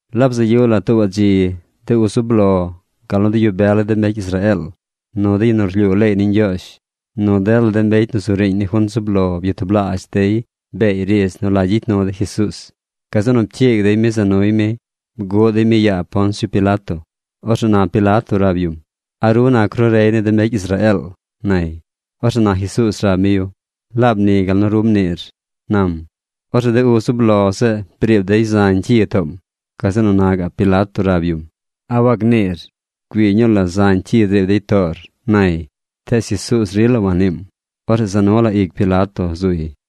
Laab bzaꞌ yu la tuubaꞌ dzi, de uz zub lo, gal nu de yu bel ni de mbecy Israeel, nu de yu nu rlyuu leey ni Ñgyoozh, nu dela de mbecy nu zu riiñ ni junt zub lo byatublaazh dey beey riidz nu la gyicy nu dey Jesuuz. Gazeꞌ nu pcyiig dey mi za nuy mi. Bguꞌ dey mi yaa Poncio Pilato. Orzeꞌ na Pilato rab yum: ―¿A ru nac ru rey ni de mbecy Israeel? ―nay. Orzeꞌ na Jesuuz rab mi yu: ―Laab ni gal nu ru mniir ―nam. Orzeꞌ de uz zub lo zeꞌ briib dey zañ cyi toom. Gazeꞌ nu na gaꞌ Pilato rab yum: ―¿A wagniir? Güii ñuu la zañ cyi driib dey toor ―nay. Tees Jesuuz rila wanniim. Orzeꞌ za nu la ic Pilato zuy.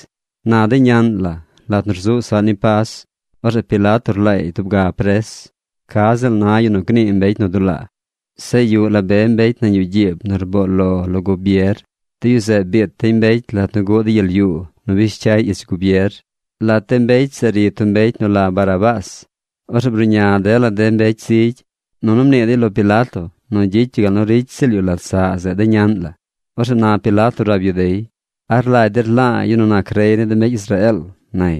Na de ñaꞌn la lat nu rzuꞌ saꞌ ni Pas, orzeꞌ Pilato rlaay tub ga pres, ca ziꞌl na yu nu gnii mbecy nu dulaa. Zeꞌ yuꞌ la be mbecy nañ yuꞌ gyiib nu rboo lo lo gubier. De yu zeꞌ biit dey mbecy lat nu guꞌ dey gyel yuu nu bish cyay ich gubier. Lat de mbecy zeꞌ ri tub mbecy nu la Barrabás. Orzeꞌ bruꞌña dela de mbecy zigy, nunu mnii dey lo Pilato nu gyicy yu gal nu ricy ziꞌl yu lat saꞌ zeꞌ de ñaꞌn la. Orzeꞌ na Pilato rab yu dey: ―¿A rlagy der la̱a̱ yu nu nac rey ni de mbecy Israeel? ―nay.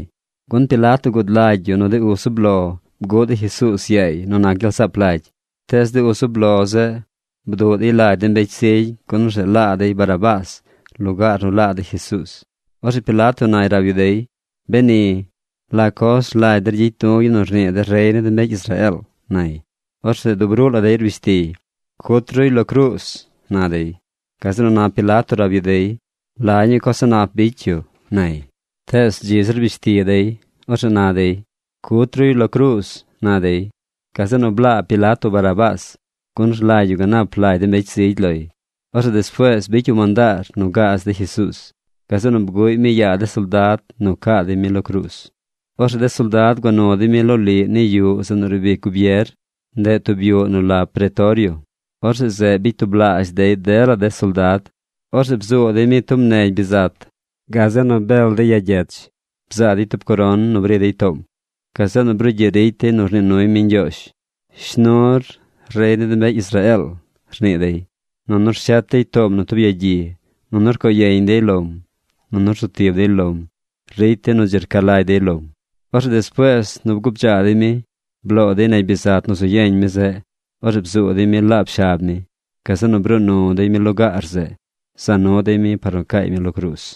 Gun Pilato gud lagy yu nu de uz zub lo bguꞌ dey Jesuuz yaay nu nac gyel saap lagy. Tees de uz zub lo zeꞌ bduꞌ dey lagy de mbecy zigy gun orzeꞌ laa dey Barrabás lugaar nu laa dey Jesuuz. Orzeꞌ Pilato nay rab yu dey: ―Beni, ¿la coz rlagy der gyicy du̱ yu nu rnii der rey ni de mbecy Israeel? ―nay. Orzeꞌ dub ruꞌ la dey rbish tiy: ―¡Cut ruy lo cruuz! ―na dey. Gazeꞌ nu na Pilato rab yu dey: ―¿La ñuu coz a̱ꞌ nap bicy yu? ―nay. Tees dzi zir rbish ti dey. Orzeꞌ na dey: ―¡Cut ruy lo cruuz! ―na dey. Gazeꞌ nu blaa Pilato Barrabás, gun rlagy yu ganap lagy de mbecy zigy loy. Orzeꞌ despuees bicy yu mandaar nu gaaz dey Jesuuz. Gazeꞌ nu bguꞌy mi yaa de soldad nu caa dey mi lo cruuz. Orzeꞌ de soldad gua nu dey mi loliꞌ ni yuꞌ zeꞌ nu riib ic gubier. (Ndeꞌ tub yuꞌ nu la pretorio.) Orzeꞌ zeꞌ bicy tublaazh dey dela de soldad. Orzeꞌ bzuu dey mi tub negy bizat. Gazeꞌ nu bel dey ya gyech bzaa dey tub coron nu bri dey toom. Gazeꞌ nu brugyiꞌ ricy dey nu rnii nuy mi ñgyoozh: ―¡Shnur, rey ni de mbecy Israeel! ―rnii dey. Nunu rshet dey toom nu tub yagyi, nunu rcoo yeñ dey lom, nunu rzu tib dey lom ricy dey nu dzi rca lagy dey lom. Orzeꞌ despuees nu bguu bdzaa dey mi, bloo dey negy bizat nu zu yeñ mi zeꞌ. Orzeꞌ bzuu dey mi laab shab mi. Gazeꞌ nu bruu nu dey mi lugaar zeꞌ, za nu dey mi par nu caay mi lo cruuz.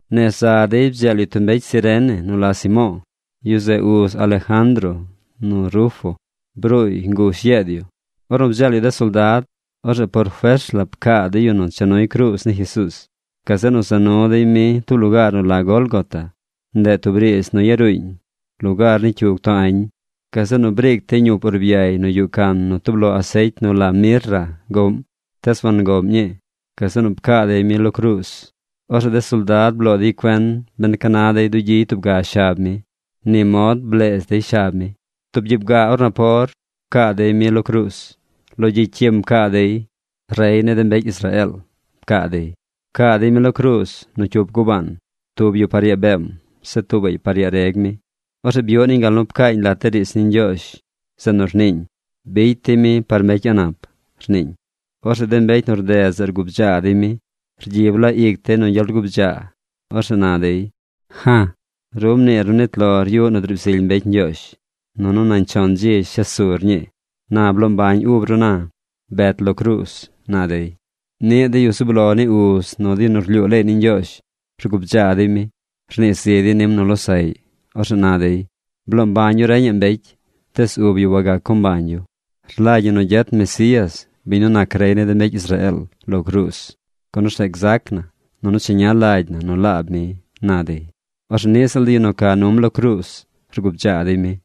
Nez za dey bdzeel yu tub mbecy Cirene nu la Simo̱o̱. Yu zeꞌ uz Alejandro nu Rufo. Bruuy ngush yeed yu. Ornu bdzeel yu de soldad, orzeꞌ por fers la pcaa dey yu nu cha nuy cruuz ni Jesuuz. Gazeꞌ nu za nu dey mi tub lugaar nu la Gólgota. Ndeꞌ tub riidz nu yaruuñ: Lugaar ni cyug too añ. Gazeꞌ nu briic dey ñup urbay nu yuꞌ can nu tub lo asecy nu la mirra goꞌm. Tees wangoꞌm ñii. Gazeꞌ nu pcaa dey mi lo cruuz. Orzeꞌ de soldad bloo dey cuen ben ca na dey dugyiy tub ga shab mi. Ni mod bleez dey shab mi. Tub gyiib gaa or napor pcaa dey mi lo cruuz. Lo gyicy cyim pcaa dey: “Rey ni de mbecy Israeel”, pcaa dey. Pcaa dey mi lo cruuz nu cyup gubaan, tub yu par yaa beem, zeꞌ tuubaꞌy par yaa reg mi. Orzeꞌ byuꞌ niñ gal nu pcaañ lat de riidz ni Ñgyoozh zeꞌ nu rniiñ: “Bicy dey mi par mbecy a̱ꞌ nap”, rniiñ. Orzeꞌ de mbecy nu rded zeꞌ rguu bdzaa dey mi. Rgyib la ic dey nu gyel rguu bdzaa. Orzeꞌ na dey: ―¡Ja̱j! Ru mniir nu nit lor yuꞌ nu driib zily mbecy Ñgyoozh nunu nañ chon dzi shes sur ñii. Na bloo mbañ ub ru na. Bet lo cruuz ―na dey. Niꞌ de yu zub lo ni uz nu de yu nu rlyuu leey ni Ñgyoozh rguu bdzaa dey mi. Rnii zi dey nim nu losaꞌy. Orzeꞌ na dey: ―Bloo mbañ yu reñaꞌ mbecy. Tees ub yu wagac co mbañ yu. Rlagy ñi nu gyet Mesías, biñ nu nac rey ni de mbecy Israeel, lo cruuz, gun orzeꞌ gzac na nunu cheña lagy na nu laab mi ―na dey. Orzeꞌ niꞌ ziꞌl de yu nu ca num lo cruuz rguu bdzaa dey mi.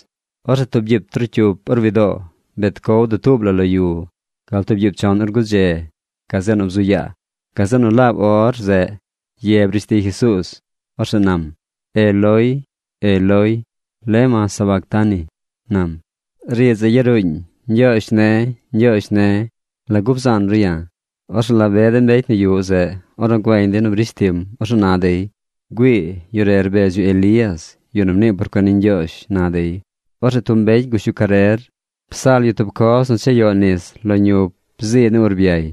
Orzeꞌ tub gyiib trocyup or widoo, bet cow dutuub la lo yu gal tub gyiib chon or gudze. Gazeꞌ nu bzu yaa. Gazeꞌ nu laab or zeꞌ ye brish ti Jesuuz. Orzeꞌ nam: ―Eloi, Eloi, ¿lema sabactani? ―nam. Riidz zeꞌ yaruuñ: Ñgyoozh ne̱, Ñgyoozh ne̱, ¿lagu bzaan ru ya̱? Orzeꞌ la be de mbecy nu yuꞌ zeꞌ, ornu güeñ dey nu brish tim, orzeꞌ na dey: ―Güii, yu re rbedz yu Elías, yu nu mnii por cuen ni Ñgyoozh ―na dey. Orzeꞌ tub mbecy gush yu carer, psal yu tub coz nu chayoꞌ nis lo ñup zii ni urbyay.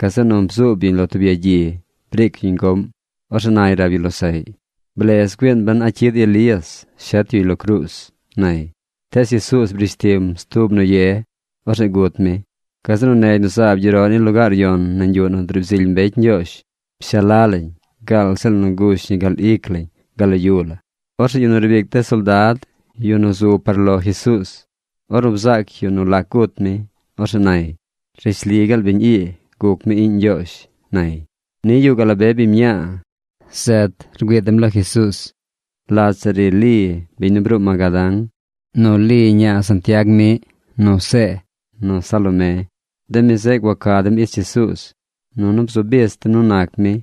Gazeꞌ nu bzuub yuñ lo tub yagyi. Briic yuñ goꞌm. Orzeꞌ nay rab yu losaꞌy: ―Blez güiin ben a cyid Elías shet yuy lo cruuz ―nay. Tees Jesuuz brish tim stub nu ye. Orzeꞌ gut mi. Gazeꞌ nu negy nu zaab gyeroꞌ ni lugaar yon nañ yuꞌ nu driib zily mbecy Ñgyoozh pshaa la lañ gaal ziꞌl nu gush ñi gal ic lañ gal lo yu la. Orzeꞌ yu nu riib ic de soldad, yu nu zu par lo Jesuuz, ornu bzaac yu nu lac gut mi, orzeꞌ nay: ―Rishli gaal biñ ii guc mi iꞌñ Ñgyoozh ―nay. Niꞌ yuꞌ gaꞌ la be biñ mñaa. Zet rgüii dem lo Jesuuz. Lat zeꞌ ri Li, biñ nu bruu Magadán, nu Li ñaa Santiag miꞌ nu See, nu Salomé. De mi zeꞌ gua ca dem ich Jesuuz, nunu bzu bich dem nu nac mi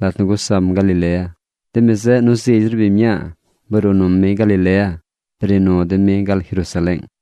lat nu gusam Galilea. De mi zeꞌ nu zigy zir biñ mñaa bruu num mi Galilea bri nu dem mi gal Jerusaleeng.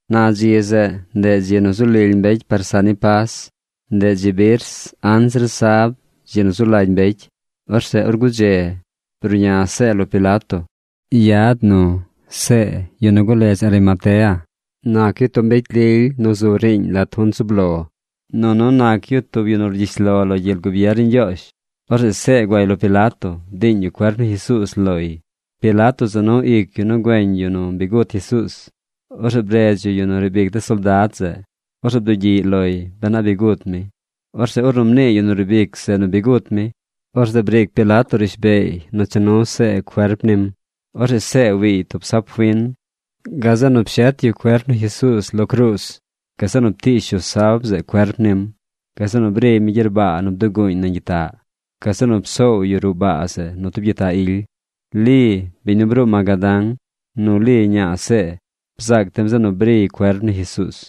Na dzi zeꞌ, ndeꞌ dzi nu zu lily mbecy par saꞌ ni Pas. Ndeꞌ dzi birs anzir sab dzi nu zu lagy mbecy. bruꞌña See lo Pilato. Yad nu See yu nu guledz Arimatea. Nac yu tub mbecy lily nu zu riiñ lat junt zub lo. Nunu nac yu tub yu nu rcyish lo lo gyel gubier ni Ñgyoozh. Orzeꞌ See guay lo Pilato bdiiñ yu cuerp ni Jesuuz loy. Pilato za nu ic yu nu güeñ yu nu bi gut Jesuuz. Orzeꞌ bredz yu yu nu riib ic de soldad zeꞌ. Orzeꞌ bdugyiꞌy loy ben a bi gut mi. Orzeꞌ ornu mnii yu nu riib ic zeꞌ nu bi gut mi, orzeꞌ briic Pilato rishbeey nu cha nu See cuerp nim. Orzeꞌ See wiiy tub sab fin. Gazeꞌ nu pshet yu cuerp ni Jesuuz lo cruuz. Gazeꞌ nu ptiish yu sab zeꞌ cuerp nim. Gazeꞌ nu briy mi gyerbaa nu bduguuñ nañ gyitaꞌ. Gazeꞌ nu psoow yu ruꞌ baa zeꞌ nu tub gyitaꞌ ily. Li, biñ nu bruu Magadán, nu Li ñaa See bzaac dem zeꞌ nu briy cuerp ni Jesuuz.